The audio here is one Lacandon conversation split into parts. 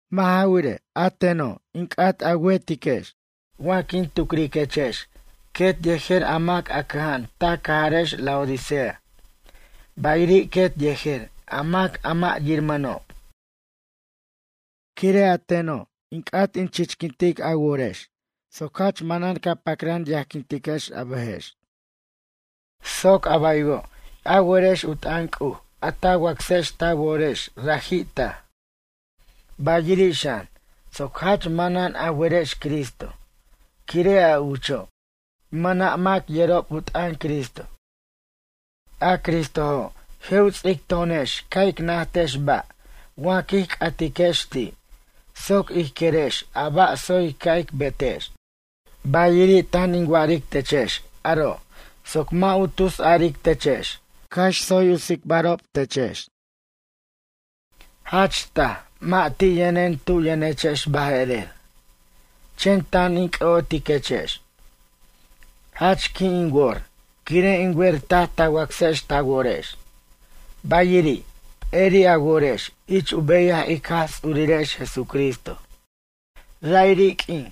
Mʌ' ja wirej, a teno' in c'at a wertiquex wa quin tucriquechex quet yejer a mac a cʌja'an ta cajarex Laodicea, bayiri' quet yejer a mac a mʌ' yirmʌnob. Quire' a teno' in c'at in chichquintic a worex soc jach manan ca pacran yajquintiquex a bʌjex, soc a baywo' a werex u t'ʌn C'uj a ta wacsex ta worex raji' taj. Bayiri' xan, soc jach manan a werex Cristo, quire' a ucho', mac mʌna' yerob u t'ʌn Cristo. A Cristojo' je' u ts'ic to'onex ca' ic najtex ba' wa quij c'atiquex ti', soc ij querex a ba' tsoy ca' ic betex. Bayiri' tan in wa'aric techex aro' soc mʌ' u tusaric techex cax tsoy u tsicbarob techex. Jach taj mʌ' ti' yʌnen tu yʌnechex baje'rer, chen tan in c'ʌ'otiquechex. Jach qui' in wor quire' in wer taj ta wacsex ta worex, bayiri', p'eri' a worex ich u beyaj ic Jaj Ts'urirex Jesucristo. Ra'iri' q'uin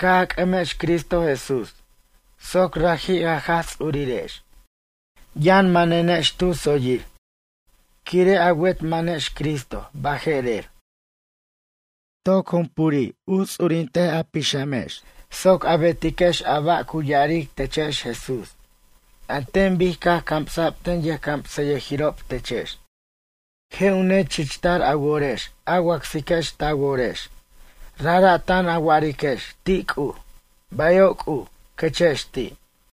caj a c'ʌmex Cristo Jesús soc raji' a Jaj Ts'urirex, yʌn manenex tu tsoyir, quire' a wet manex Cristo baje'rer. Toc jumpuri' u ts'urint a pixamex soc a betiquex a ba' cu ya'aric techex Jesús, an ten bic caj cams'b ten yʌjcamsayʌjirob techex. Je' u nechichtar a worex a wacsiquex ta worex, rajra' tan a wa'ariquex ti' C'uj: “Bayo' C'uj”, quechex ti'.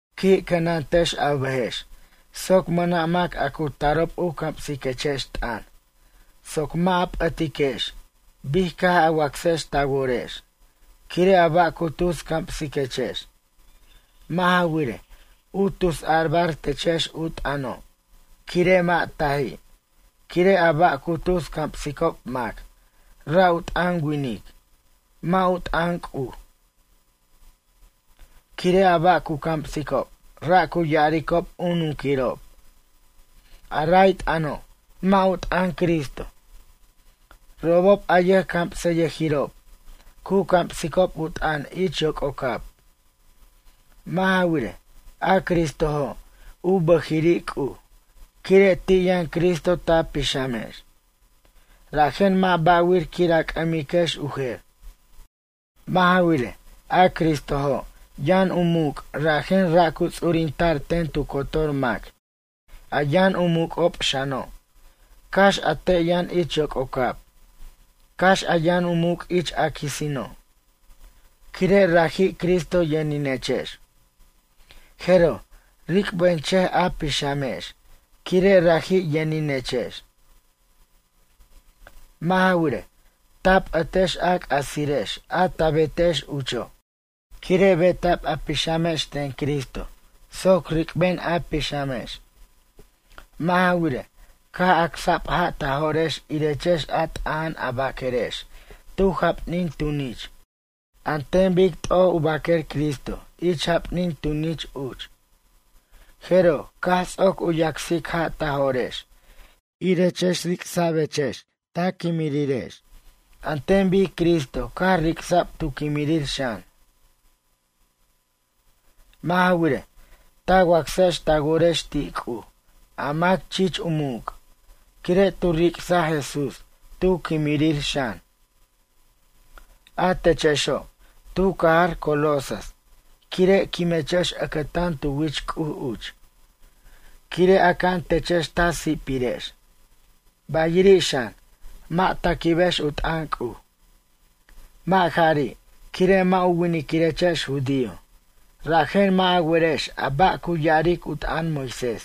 Qui' cʌnantex a bʌjex soc mʌna' mac a cu tarob u camsiquechex t'ʌn soc mʌ' a p'ʌtiquex bic caj a wacsex ta worex quire' a ba' cu tus camsiquechex. Mʌ' ja wirej, u tusarbar techex u t'ʌno' quire' mʌ' taji', quire' a ba' cu tus camsicob mac ra' u t'ʌn winic, mʌ' u t'ʌn C'uj. Quire' a ba' cu camsicob ra' cu ya'aricob u nunquirob. A ray t'ʌno' mʌ' u t'ʌn Cristo. Robob a yʌjcamsayʌjirob, cu camsicob u t'ʌn ich yoc'ocab. Mʌ' ja wirej, a Cristojo' u bʌjiri' C'uj. Quire' ti' yʌn Cristo ta pixamex, rajen mʌ' ba'wir quir a c'ʌmiquex u jer. Mʌ' ja wirej, a Cristojo' yʌn u muc' rajen ra' cu ts'urinta'r ten tu cotor mac a yʌn u muc'ob xano' cax a te' yʌn ich yoc'ocab cax a yʌn u muc' ich a quisino'. Quire' raji' Cristo yʌninechex, jeroj ric'benchʌj a pixamex quire' raji' yʌninechex. Mʌ' ja wirej, ta p'ʌtex a c'asirex a ta betex ucho' quire' beta'b a pixamex ten Cristo soc ric'ben a pixamex. Mʌ' ja wirej, caj acsa'b ja' ta jo'rex irechex a t'aja'an a baquerex tu japnin tunich a ten bic t'oj u baquer Cristo ich japnin tunich uch. Jeroj caj ts'oc u yacsic ja' ta jo'rex irechex ric'sa'bechex ta quimirirex an ten bic Cristo caj ric'sa'b tu quimirir xan. Mʌ' ja wirej, ta wacsex ta worex ti' C'uj a mac chich u muc', quire' tu ric'saj Jesús tu quimirir xan. A techexo', tu cajar Colosas, quire' quimechex ʌcʌtan tu wich C'uj uch, quire' aca'an techex ta si'pirex, bayiri' xan, mʌ' ta quibex u t'ʌn C'uj. Mʌ' jari', quire' mʌ' u winiquirechex judío, rajen mʌ' a werex a ba' cu ya'aric u t'ʌn Moisés.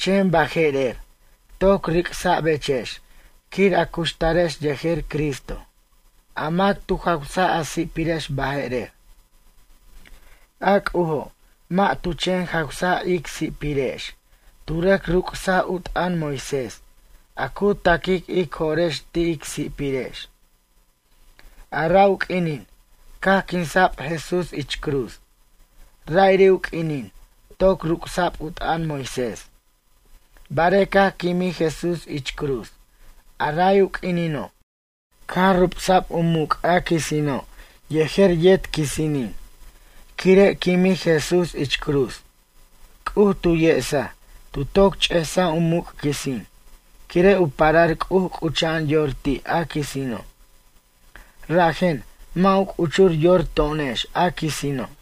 Chen baje'rer, toc ric'sa'bechex quir a cuxtarex yejer Cristo, a mac tu jawsaj a si'pirex baje'rer. A C'ujo', mʌ' tu chen jawsaj ic si'pirex, tu rʌc ruc'saj u t'ʌn Moisés, a cu ta'quic ic jo'rex ti' ic si'pirex. A ra' u q'uinin caj quinsa'b Jesús ich cruz, ra'iri' u q'uinin toc ruc'sa'b u t'ʌn Moisés. Bare' caj quimij Jesús ich cruz, a ray u q'uinino', caj rubsa'b u muc' a quisino' yejer yet quisinin. Quire' quimij Jesús ich cruz, C'uj tu yesaj, tu toc ch'esaj u muc' quisin, quire' u parar C'uj c'ucha'an yor ti' a quisino'. Rajen, mʌ' u c'uchur yor to'onex a quisino'.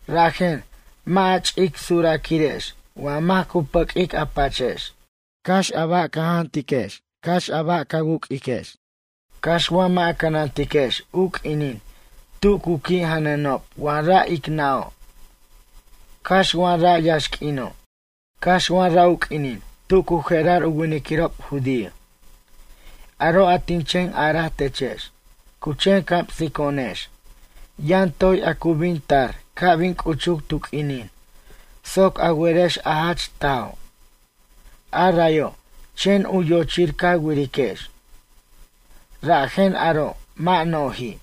Rajen, mʌ' a ch'ic suraquirex wa mac cu pʌq'uic a pachex, cax a ba' ca jantiquex, cax a ba' ca wuc'urex, cax wa mʌ' a cʌnantiquex u q'uinin tu cu qui' janʌnob wa ra' ic nʌ'o', cax wa ra' yaxq'uino', cax wa ra' u q'uinin tu cu je'rar u winiquirob judío. Aro' a tin chen araj techex, cu chen camsico'onex, yʌn toy a cu bin tar ca' bin c'uchuc tu q'uinin soc a werex a jach tajo', a rayo' chen u yochir ca wiriquex. Rajen aro' mʌ' noji',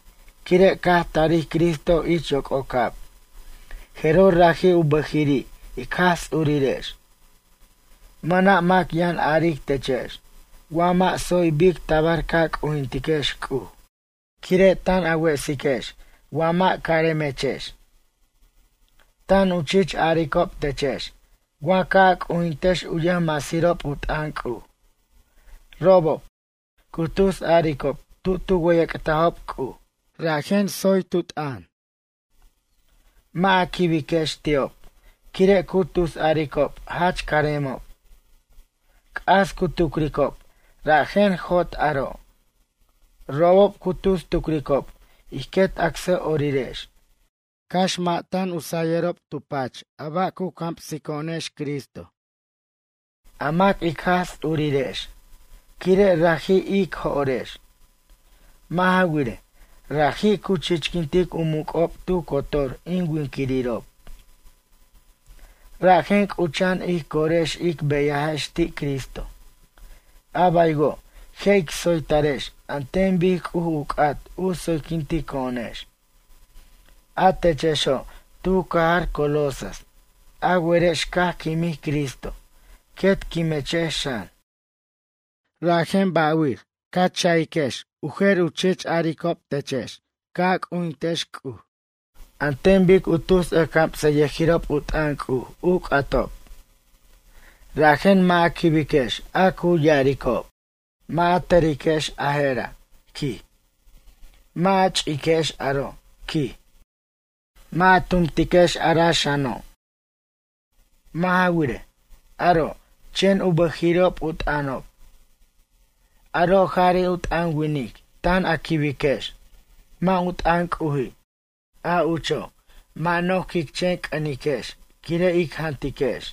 quire' caj tarij Cristo ich yoc'ocab jeroj raji' u bʌjiri' ic Jaj Ts'urirex. Mʌna' mac yʌn aric techex wa mʌ' tsoy bic tabar ca c'ujintiquex C'uj, quire' tan a wesiquex wa mʌ' caremechex. Tan u chich aricob techex wa ca' a c'ujintiquex u yʌjmasirob u t'ʌn C'uj. Robob, cu tusaricob tu tu wʌyʌc'tajob C'uj, rajen tsoy tu t'ʌn. Mʌ' a quibiquex ti'ob quire' cu tusaricob jach caremob. C'as cu tucricob rajen jot aro'. Robob cu tus tucricob ij quet acsʌ'orirex, cax mʌ' tan u sayʌrob tu pach a ba' cu camsico'onex Cristo, a mac ic Jaj Ts'urirex, quire' raji' ic jo'rex. Mʌ' ja wirej, raji' cu chichquintic u muc'ob tu cotor in winquirirob. Rajen, c'ucha'an ij corex ic beyajex ti' Cristo, a baywo' je' ic tsoytarex an ten bic C'uj u c'at u tsoyquintico'onex. A techexo' tu cajar Colosas, a werex caj quimij Cristo quet quimechex xan. Rajen, ba'wir ca cha'iquex u jer u chich aricob techex ca' a c'ujintiquex C'uj an ten bic u tus ʌjcamsayʌjirob u t'ʌn C'uj u c'atob. Rajen mʌ' a quibiquex a cu ya'aricob: “Mʌ' a tʌriquex a je'ra', quij. Mʌ' a chi'iquex aro', quij, mʌ' a tumtiquex ara xano'.” Mʌ' ja wirej, aro' chen u bʌjiri'ob u t'ʌnob. Aro' jari' u t'ʌn winic tan a quibiquex, mʌ' u t'ʌn C'uji'. A ucho', mʌ' no'j quic chen c'ʌniquex quire' ic jantiquex.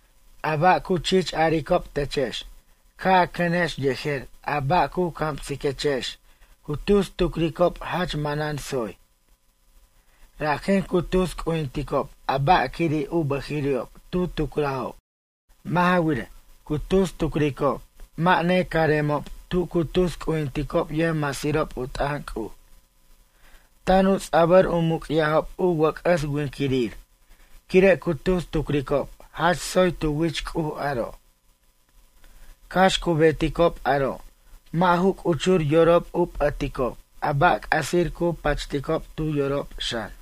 A ba' cu chich aricob techex ca' a cʌnex yejer a ba' cu camsiquechex cu tus tucricob jach manan tsoy. Rajen cu tus c'ujinticob a ba'quiri' u bʌjiri'ob tu tucrajob. Mʌ' ja wirej, cu tus tucricob mʌ' necaremob tu cu tus c'ujinticob yʌjmasirob u t'ʌn C'uj. Tan u ts'a'bʌr u muc'yajob u wʌc'ʌs winquirir quire' cu tus tucricob jach tsoy tu wich C'uj aro'. Cax cu beticob aro' mʌ' ju c'uchur yorob u p'ʌticob a ba' c'asir cu pachticob tu yorob xan.